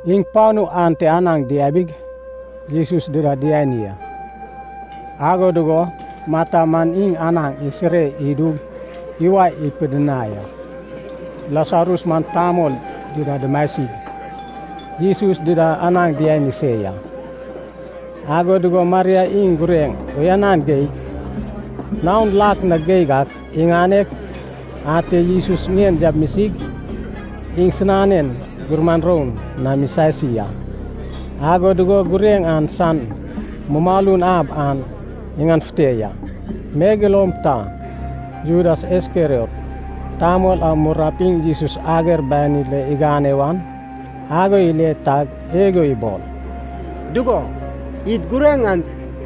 Iŋ panu ante anaŋ diabig, Jesus dida diani a. Ago dugo Marta man iŋ anaŋ isire idug iwae ipidinai a. Lasarus man tamol dida dumasig, Jesus dida anaŋ diani se ya. Ago dugo Maria iŋ gureŋ uyanan geig, naon lak na geig ak iŋaneg, ate Jesus ŋien yamisig, iŋsinanen gumuran roun nam isasi a. Ago dugo gureŋ an san mumalun ab an iŋanefute ya. Megeloum ta, Judas Iskeriot tamol a murnap iŋ Jesus ager banid lo igane wan, ago ile tag igo ibol, “Dugo, id gureŋ an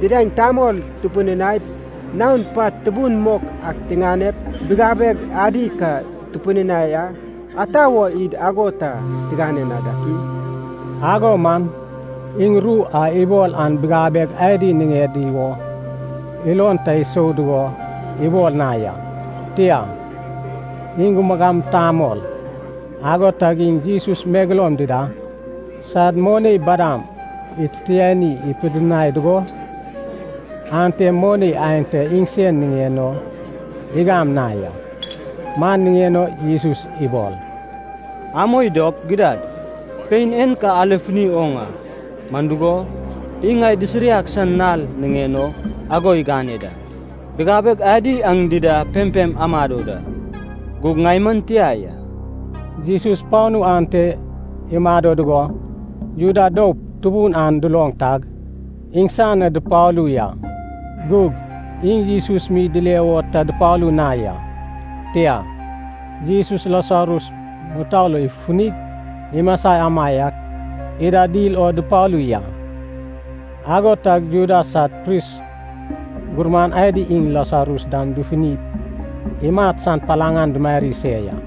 didaeŋ tamol tupidinaip, naon pat tubun mok ak tiŋanep bigabeg adi ka tupidinai a. Ata wo id ago ta tigane na yak i?” Ago man iŋ ru a ibol an bigabeg adi niŋedi wo ilon ta isou dugo ibol na ya. Tia, iŋ gumagam tamol, ago tag iŋ Jesus megeloum dida sad moni badam ititiani pidinai dugo, ante moni aenta iŋsen niŋen o igam na ya. Man niŋen o Jesus ibol, “Amoi dop, gidad, pein en ka alefuni oŋ a, man dugo, iŋ ŋai disiriag san nal niŋen o ago igane da. Bigabeg adi aŋ dida pempem amado da, gug ŋai man tia ya.” Jesus panu ante imado dugo, Juda doup tubun an duloŋ tag, iŋsan na dupalu ya. Gug iŋ Jesus mi dile wo ta dupalu na ya. Tia, Jesus Lasarus mutou lo ifufunig imasa amaiak ida dil o dupalu ya. Ago tag Juda sad pris gurman adi iŋ Lasarus dam dufunip imat san palaŋ an dumari se ya.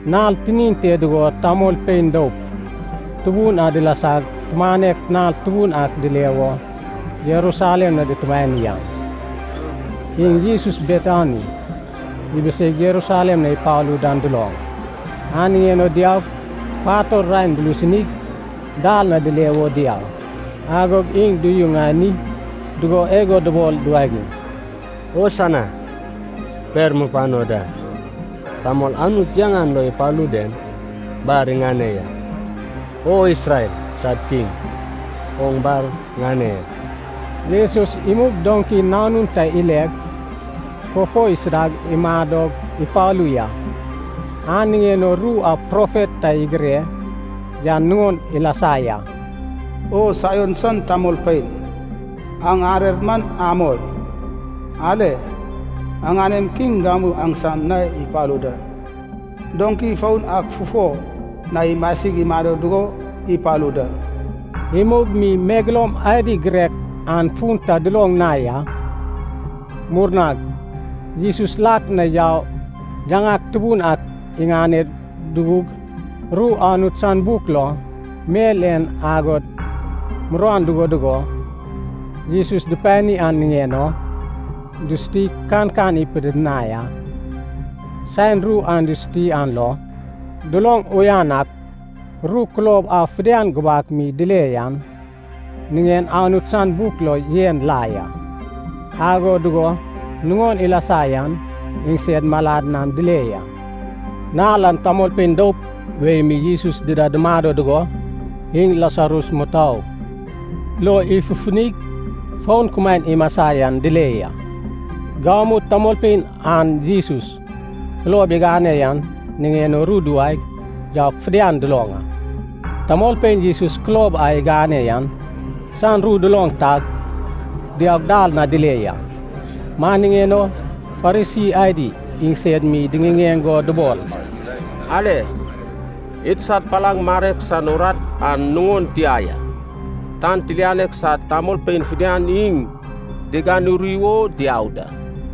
Nal tinin te dugo tamolpein doup tubun a dilasag tumanek nal tubun ak dile wo Jerusalem na dutumani an, iŋ Jesus Betani ibiseig Jerusalem na ipalu dan duloŋ. An niŋen o diaug, pator raen dulusunig, dal na dile wo diau. Agog iŋ duyuŋani dugo igo dubol duwagiŋ, “Hosana, per mupano da! Tamol Anut yaŋan lo ipalu den bar iŋane ya! O Isrel sad Kiŋ, oŋ bar ŋane ya!” Jesus imug doŋki nanun ta ileg, fufo isudag imadog ipalu ya. An niŋen o ru a profet ta igire yan nuŋon ilasa ya. “O Saion san tamolpein, aŋ arer man amoi. Ale, aŋanem Kiŋ gamu aŋsam na ipalu da. Doŋki foun ak fufo na imasig imado dugo ipalu da.” Imug mi megeloum adi girek an fun ta duloŋ na ya. Murnag, Jesus lak na yaug yaŋak tubun ak iŋane dugug, ru Anut san buk lo, mel en agod muruan dugo dugo Jesus dupani an niŋen o, dusutig kankan ipidinai a. Saen ru an dusuti an lo, duloŋ uyan ak, ru kulob a fidian gubak mi dile yan niŋen Anut san buk lo yen la ya, ago dugo nuŋon ilasa yan iŋsed malan nam dile ya. Nal an tamolpein doup wei mi Jesus dida dumado dugo, iŋ Lasarus mutou lo ifufunig fon kumaen imasa yan dile ya. Gamu tamolpein an Jesus kulob igane yan niŋen o ru duwaeg yaug fidian duloŋ a. Tamolpein Jesus kulob a igane yan san ru duloŋ tag, diaug dal na dile ya. Man niŋen o Farisi adi iŋsed mi diŋiŋeŋ go dubol, “Ale. Idsad palaŋ marek san urat an nuŋon tia ya. Tan tilianek sad tamolpein fidian iŋ diganuri wo diau da!”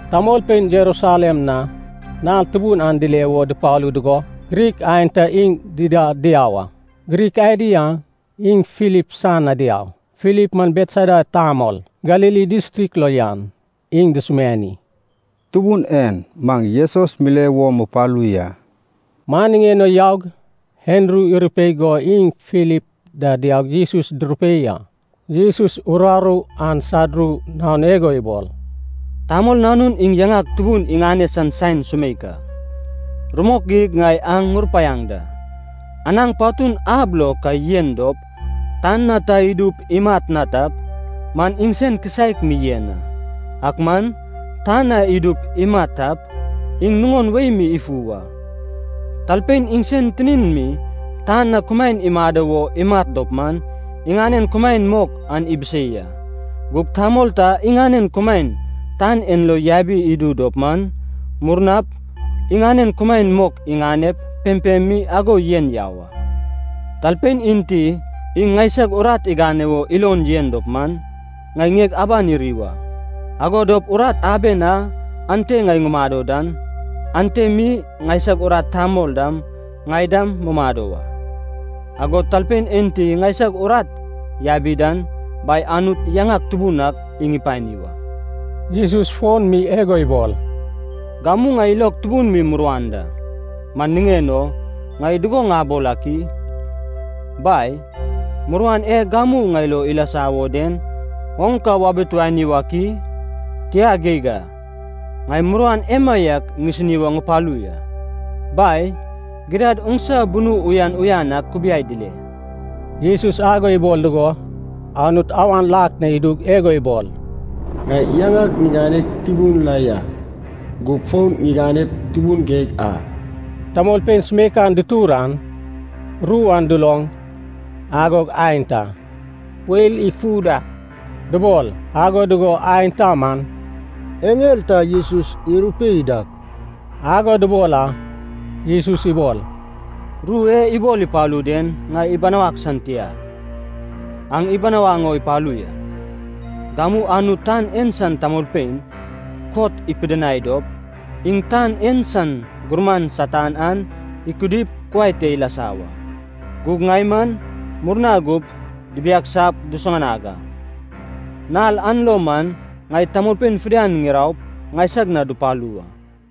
Tamolpein Jerusalem na nal tubun an dile wo dupalu dugo, Grik aenta iŋ dida diau a. Grik adi an iŋ Filip san na diau. Filip man Betsaida tamol, Galili distrik lo yan, iŋ dusumiani, “Tubun en, maŋ Jesus mile wo mupalu ya.” Man niŋen o yaug, Andru irupei go iŋ Filip da diaug Jesus durupei a. Jesus uraru an sad ru naon igo ibol, “Tamol Nanun iŋ yaŋak tubun iŋane san saen sumeik a. Rumok geig ŋai aŋ ŋurupaiaŋ da, anaŋ patun ab lo ka yen dop, tan na ta idup imat na tap, man iŋsen kisaek mi yen a. Ak man, tan na idup imat tap, iŋ nuŋon wei mi ifu wa. Talpein iŋsen tinin mi tan na kumaen imado wo imat dop man, iŋanen kumaen mok an ibisei a. Gug tamol ta iŋanen kumaen tan en lo yabi idu dop man, murnap iŋanen kumaen mok iŋanep, pempem mi ago yen yau a. Talpein enti iŋ ŋaisag urat igane wo ilon yen dop man, ŋai ŋieg aban iri wa. Ago dop urat aben a ante ŋai ŋumado dan, ante mi ŋaisag urat tamol dam ŋai da mumado wa. Agod talpein enti ŋaisag urat yabi dan, Bai Anut yaŋak tubun ak iŋ ipani wa.” Jesus fon mi igo ibol, “Gamu ŋai ilog tubun mi muruan da. Man niŋen o, ŋai dugo ŋabol ak i? Bai, muruan e gamu ŋai lo ilasa wo den oŋ ka wabituani wak i? Tia geig a, ŋai muruan emaiak ŋisini wo ŋupalu ya. Bai, gidad oŋsa bunu uyan uyan ak kubiai dile!” Jesus ago ibol dugo, Anut awan lak na idug igo ibol, “Ŋai yaŋag ŋiganeg tubun la ya. Gug fon ŋiganep, tubun geig a.” Tamolpein sumeikan dutur an, ru an duloŋ, agog aenta “weil ifu dak” dubol, ago dugo aenta man “eŋel ta Jesus irupei dak” ago dubol a. Jesus ibol, “Ru e ibol ipalu den ŋai ibinawag san tia, aŋ ibinawaŋ o ipalu ya. Gamu Anut tan en san tamolpein kot ipidinai dop, iŋ tan en san gurman Satan an ikudip kuai te ilasa wa. Gug ŋai man, murna gup dibiagsap dusuŋanag a. Nal an lo man ŋai tamolpein fidian ŋiraup, ŋaisag na dupalu wa.”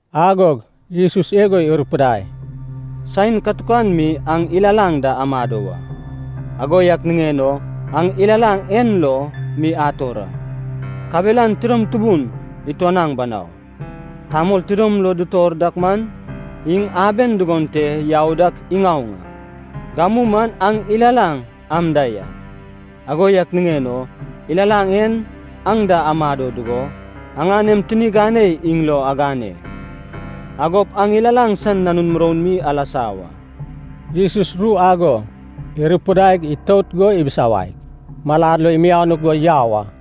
Agog Jesus igo irupidai, “Saen katukan mi aŋ ilalaŋ da amado wa. Ago yak niŋen o aŋ ilalaŋ en lo mi ator a. Kabelan tidom tubun ituanaŋ banau. Tamol tidom lo itor dak man, iŋ aben dugon te yau dak iŋaoŋ a. Gamu man aŋ ilalaŋ am da ya. Ago yak niŋen o, ilalaŋ en aŋ da amado dugo, aŋanem tini ganei iŋ lo agane. Agop aŋ ilalaŋ san nanun muroun mi alasa wa.” Jesus ru ago irupidaig itout go ibisawaig, malad lo imianuk go yau a.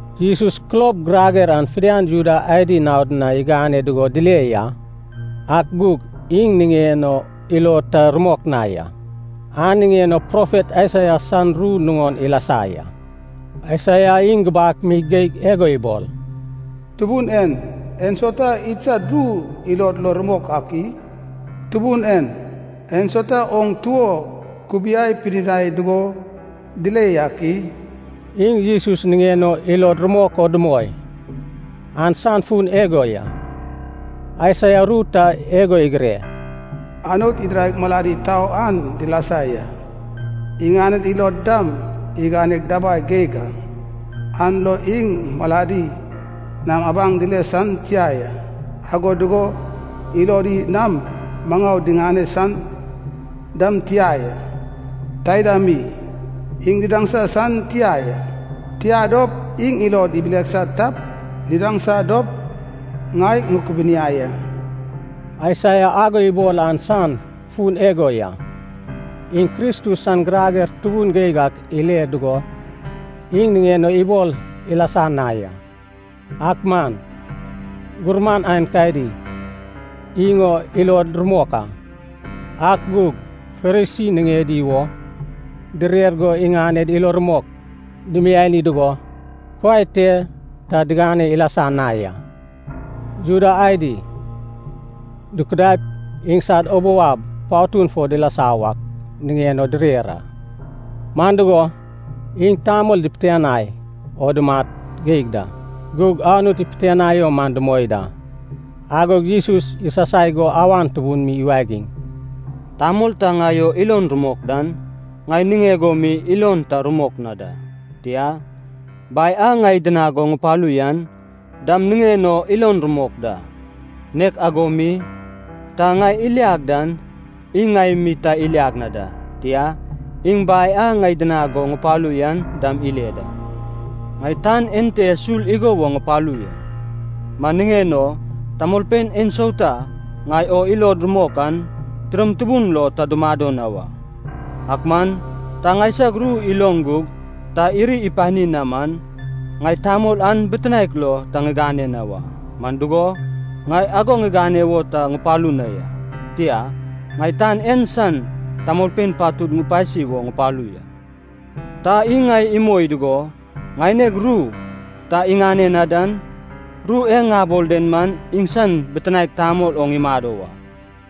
Jesus kulob girager an fidian Juda adi naod na igane dugo dile ya, ak gug iŋ niŋen o ilod ta rumok na ya. An niŋen o profet Aisaia san ru nuŋon ilasa ya. Aisaia iŋ gubak mi geig igo ibol, “Tubun en, ensauta idsad ru ilod lo rumok ak i? Tubun en, ensauta oŋ tuo kubiai pidinai dugo dile yak i?” Iŋ Jesus niŋen o ilod rumok o dumoi, an san fun igo ya. Aisaia ru ta igo igire, “Anut idiraig malad itau an dilasa ya, iŋaned ilod dam iganeg dabai geig a. An lo iŋ maladi nam abaŋ dile san tia ya, ago dugo ilodi nam maŋau diŋane san dam tia ya, taida mi, iŋ didaŋsa san tia ya, tia dop, iŋ ilod ibilisa tap didaŋsa dop ŋai ŋukubuniai a.” Aisaia ago ibol an san fun igo ya. Iŋ Kristus san girager tubun geig ak ile dugo, iŋ niŋen o ibol ilasa na ya. Ak man gurman aenkadi iŋ o ilod rumok a. Ak gug Farisi niŋedi wo direr go iŋaned ilo rumok dimiani dugo, kuai te ta digane ilasa na ya. Juda adi dukudaip iŋsad ubou ab patun fo dilasa wak niŋen o direr a. Man dugo, iŋ tamol dipitianai o dumat geig da, gug Anut ipitianai o man dumoi da. Agog Jesus isasai go awan tubun mi iwagiŋ, “Tamol ta ŋai o ilon rumok dan, ŋai niŋeg o mi ilon ta rumok na da. Tia, Bai a ŋai idinag go ŋupalu yan dam niŋen o ilon rumok da. Nek ago mi, ta ŋai iliag dan, iŋ ŋai mi ta iliag na da. Tia, iŋ Bai a ŋai idinag go ŋupalu yan dam ile da. Ŋai tan ente sul igo woŋ ŋupalu ya. Man niŋen o tamolpein ensauta ŋai o ilod rumok an, tidom tubun lo ta dumado na wa. “Ak man, ta ŋaisag ru iloŋ gug ta iri ipani na man, ŋai tamol an bitinaek lo ta ŋigane na wa. Man dugo, ŋai ago ŋigane wo ta ŋupalu na ya. Tia, ŋai tan en san tamolpein patud ŋupasi wo ŋupalu ya. Ta iŋ ŋai imoi dugo ŋaineg ru ta iŋane na dan, ru e ŋabol den man iŋsan bitinaek tamol oŋ imado wa.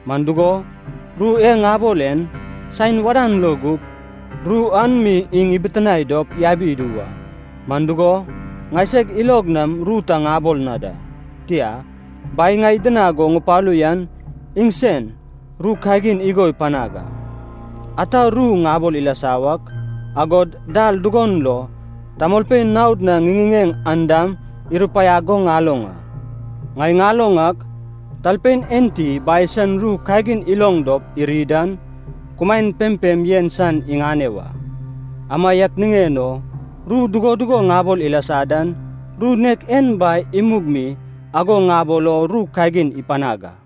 Man dugo, ru e ŋabol en, saen wadan lo gup, ru an mi iŋ ibitinae dop yabi idu wa. Man dugo, ŋaiseg ilog nam ru ta ŋabol na da. Tia, Bai ŋai idinag go ŋupalu yan iŋsen ru kagin igo ipanag a, ata ru ŋabol ilasa wak, agod dal dugon lo tamolpein naod na ŋiŋiŋeŋ an dam irupaiag go ŋaloŋ a. Ŋai ŋaloŋ ak, talpein enti Bai san ru kagin iloŋ dop iri dan, kumaen pempem yen san iŋane wa. Amaiak niŋen o, ru dugo dugo ŋabol ilasa dan, ru nek en Bai imug mi ago ŋabol o ru kagin ipanag a.”